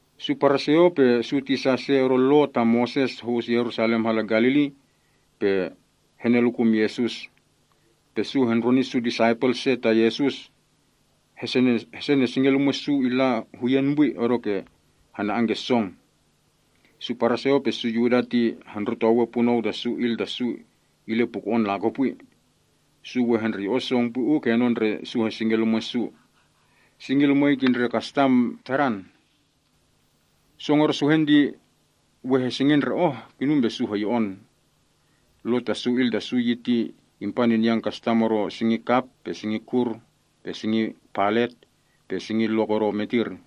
Su Paraseo pe su tisa se odo Lo ta Moses ho‑us Yerusalem hala Galili pe henelukum Yesus. Pe su hendroni su disaipel se ta Yesus hesenesingen lumwe’ su illa huyen pwi, odoke ke hana‑an ke song. (Su Paraseo pe su Yuda ti hondrotowe punou ta su il ta su ti ile puko‑on lakopwi. Su we hendreyo‑on song pwi uu kenon ndre su hesingen lumwe’ su. Singi lumwei ti ndre kastam tadan. Song odo suhen ti we hesingen ndre oh, kinum pe su hoyo‑on. Lo ta su il ta su yi ti ipaninyan kastam odo singi kap, pe singi kur, pe singi palet, pe singi lok odo metir.)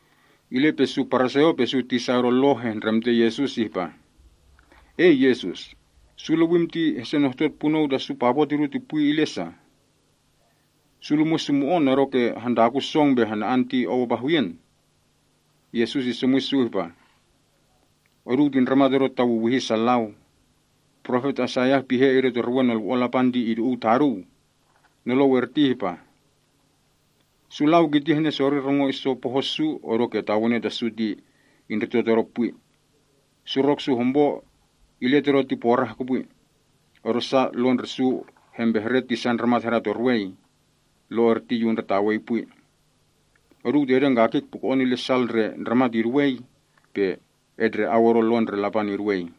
Ile pe su Paraseo pe su tisa odo Lo hehndremte Yesus ihpa, “Ei, Yesus. Su lewim ti hesenohtot punou ta su papo’ tidu pwi ti ile sa? Su lumwe’ su mo‑on odoke hantakun song pe hana‑an ti ou apa huyen?” Yesus isomwi su ihpa, “Oduu ti ndramat odo tawiwihi sa lau. Profet Aisaiah pihe idetorwe Nolwo‑on Lapan ti idu‑uw taduu. Nolou erti ipe ihpa: “‘Su lau kiti henesori rongo iso poho’ su, odoke tawene ta su ti indrito Todo pwi. Surok su hompo ile Todo ti porah kopwi. odosa lo ndre su hempehre ti sa ndramat hadatorwei. Lo erti Yu undretawei pwi.’ Oduu ti edengkakik puko‑on ile sal ndre ndramat iduwei, pe etndre‑au odo Lo ndre Lapan iduwei.”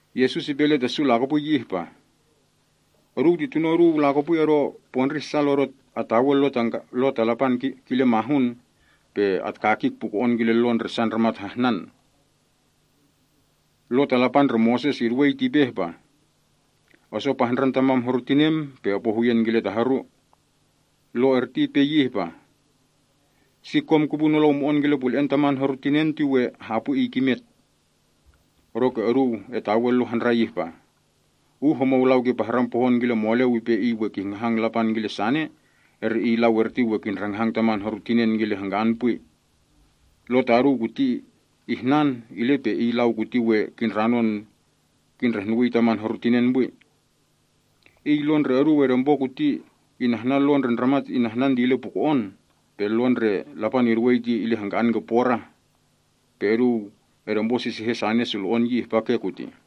Yesus ipe ile ta su lakopwi yi ihpa, “Oduu ti tuno’ oduu lakopwi odo pondrih sal odo atawe Lo ta Lapan kile mahun, pe atkakik puko‑on kile lo ndre sa ndramat hahnan. Lo ta Lapan ndre Moses iduwei ti ipe ihpa, ‘Oso pahndran tamam horu tinem, pe opo huyen kile ta horu.’ Lo erti ipe yi ihpa, ‘Si kom kipu nolou mo‑on kile pule‑en taman horu tinen ti we hapwi iy kimet.’ Odoke oduu etawe lo handrai ihpa, ‘Uh homou lau kipahran pohon kile moleu ipe iy we kihngahang Lapan kile sane, eri iy lau erti we kindrahngahang taman horu tinen kile hangka‑an pwi.’ Lo taduu kuti ihnan, ile pe iy lau kuti we kindranon kindrehnuwii taman horu tinen pwi. Iy lo ndre oduu edempo kuti inahnan lo ndre ndramat ihnan ti illa puko‑on, pe Lo ndre Lapan iduwei ti illa hangka‑an ke porah. Pe oduu edemposisihen sane sulo‑on yi ihpa ke kutih.”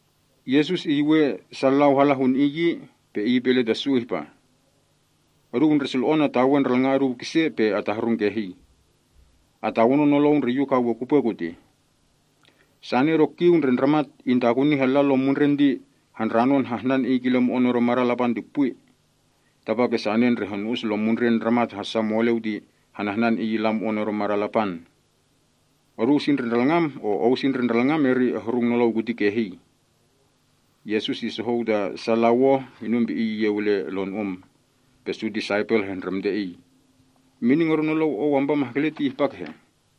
Yesus iyuwen sa lau hala hun Iy yi, pe ipe ile ta su ihpa, “Oduu ndre sulo‑on atawe ndralnga’ oduu kise, pe atahrung kehii. Atawonon nolou ndre Yu ka we kupwe kutih. Sane odo kiu ndre ndramat intakuni hala lom mundren ti handranon hahnan iy kile mo‑on odo madan Lapan pwi. Tapake sane ndre honu‑us lom mundren ndramat hassa moleu ti hanahnan iy illa mo‑on odo madan Lapan. Ou si ndre ndralngam, eri ehrungi nolou kuti kehii.” Yesus isohou ta sa lau oh, inum pe Iy iyeu ile lonu‑um. Pe su disaipel hehndremte Iy, “Mining odo nolou Ou ampa mahkele ti ihpa kehe?”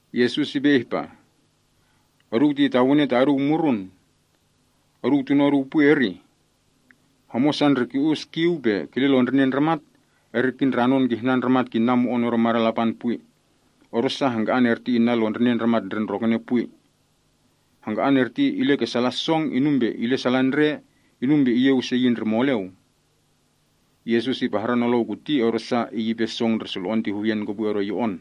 Yesus ipe ihpa, “Oduu ti tawene ta oduu murun. Oduu tuno’ oduu pwi, erih? Homosa ndre ki‑us kiu pe kile lon ndrinen ndramat, eri kindranon kihnan ndramat kinna mo‑on odo madan Lapan pwi, odosa hangka‑an erti inna lon ndrinen ndramat ndre ndrokene pwi. Hangka‑an erti ile ke salan song, inum pe ile salan ndre, inum pe iyeu ise yi ndre moleu.” Yesus ipahran nolou kuti, odosa iy ipe song ndre sulo‑on ti huyen kopwi odo yo‑on.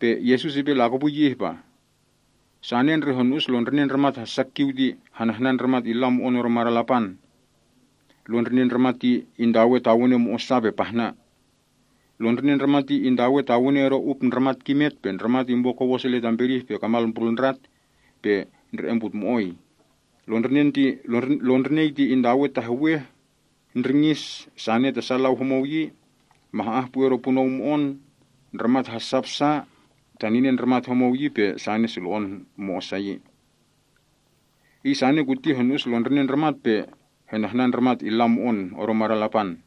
Pe Yesus ipe lakopwi yi ihpa, “Sane ndre honu‑us lon ndrinen ndramat hassa kiu ti hanahnan ndramat illa mo‑on odo madan Lapan. Lon ndrinen ndramat ti intawe tawene mo‑osa pe pahna. Lon ndrinei ti intawe tawene odo up ndramat kimet, ndramat impo kowos ile tam pedih pe kamal mbrulndrat, pe ndre‑em putmo‑oi. Lon ndrinei ti intawe taheweh, ndringis sane ta lau homou yi, mah‑ah pwi odo punou mo‑on, ndramat hassap sa, taninen ndramat homou yi pe sane sulo‑on mo‑osa yi. Iy sane kuti honu‑us lon ndrinen ndramat pe henahnan ndramat illa mo‑on odo madan Lapan.”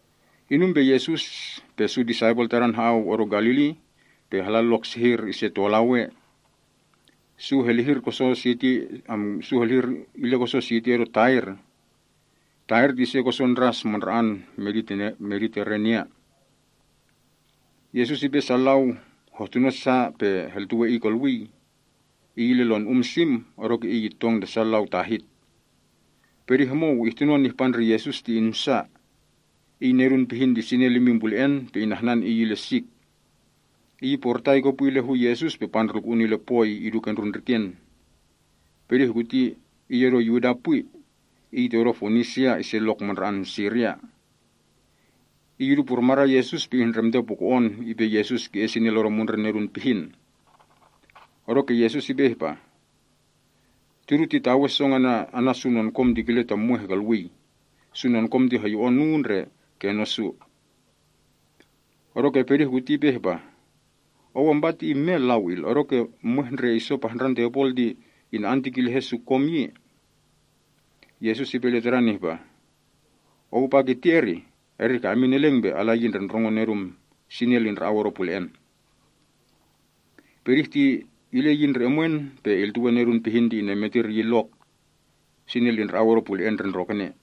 Inum pe Yesus pe su disaipel Tadan ha‑au odo Galili, pe hala lok sehir ise tolau ea. Su helihir koson siti odo Tair. Tair ti ise koson ndras mandra‑an Mediterenia. Yesus ipe sa lau hohtuno sa pe heltuwe Iy kolwii. Iy ile lon um sim, odoke Iy itong ta sa lau tahit. Pedih homou ihtunon ihpa ndre Yesus ti insa. Iy nedun pihin ti sinel imin pule‑en pe inahnan iy ile sik. Iy iporitai kopwi ile hu Yesus pe pandrulku‑un ile poi idu kendrun ndriken. Pedih kuti iy odo Yuda pwi. Iy ti odo Fonisia, ise lok mandra‑an Siria. Iy idu purmadan Yesus pe ihndremte puko‑on ipe Yesus ki‑es sinel odo mundren nedun pihin. Odoke Yesus ipe ihpa, “Tidu titawe song ana’ su nonkom ti kile ta mweh kolwii. Su nonkom ti hoyo‑on oh uu ndre kenon su.” Odoke pedih kuti ipe ihpa, “Ou ampa ti imel, lau il, odoke mweh ndre iso pahndran tepol ti ina‑an tikin lehe’ su nonkom yi.” Yesus ipe ile tadan ihpa, “Ou apa ihpa kirtih? Eri ka emin eleng pe ala yi ndre ndrongon nedum. Sinel indra‑au odo pule‑en.” Pedih ti ile yi ndre omwen pe iltuwe nedun pihin ti inemetir iyin lok. Sinel indra‑au odo pule‑en ndre ndrokene.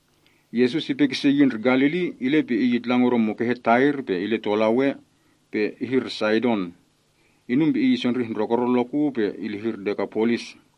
Yesus ipe kise yi ndre Galili, ile pe Iy itlang odo mukehe Tair pe ile tolau ea, pe ihir Saidon. Inum pe Iy isondrih ndrokoron lok uu pe ilihir Dekapolis.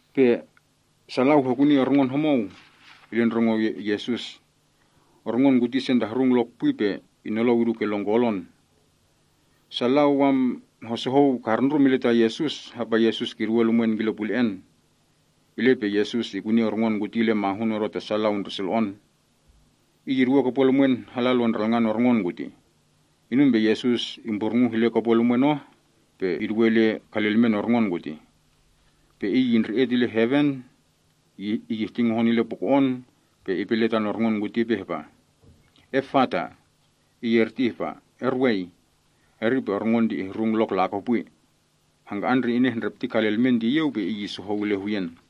Pe sa lau hekuni orngon homou ile hu Yesus. Orngon kuti isentahrung lok pwi pe inolou idu ke lon kolon. Sa lau hosohou karundrum ile ta Yesus, hapa Yesus kiduwe lumwen kile pule‑en. Ile pe Yesus ikuni orngon kuti ile mahun odo ta sa lau ndre sulo‑on. Iy iduwe kopwen lumwen hala lon ndralngan orngon kutih. Inum pe Yesus imburnguh ile kopwen lumwen oh pe iduwe ile kalilmen orngon kutih. Pe iy indre‑et ile eleng ile heven, ihti ngohon puko‑on, pe ipe ile tan orngon kuti ihpa, “Efata!” (Iy erti ihpa, “Erwei!”) Eri pe orngon ti ihrung lok lakopwi. Hangka‑an ndre inehndrepti kalilmen ti iyeu, pe iy isohou ile huyen.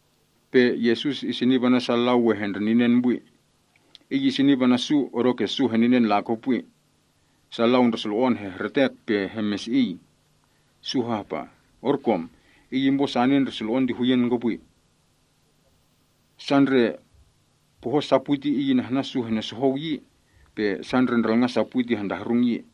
Pe Yesus isinip ana’ sa lau we hendreninen pwi. Iy isinip ana’ su odoke su heninen lakopwi. Sa lau ndre sulo‑on hehretek pe hemesi‑iy. Sa hapa ihpa, “Orkom, Iy impo sane ndre sulo‑on ti huyen kopwi. Sa lau ndre poho’ sa pwi ti Iy inahnan sa henosohou yi, pe sa ndre ndralnga’ sa pwi ti hentahrung yi.”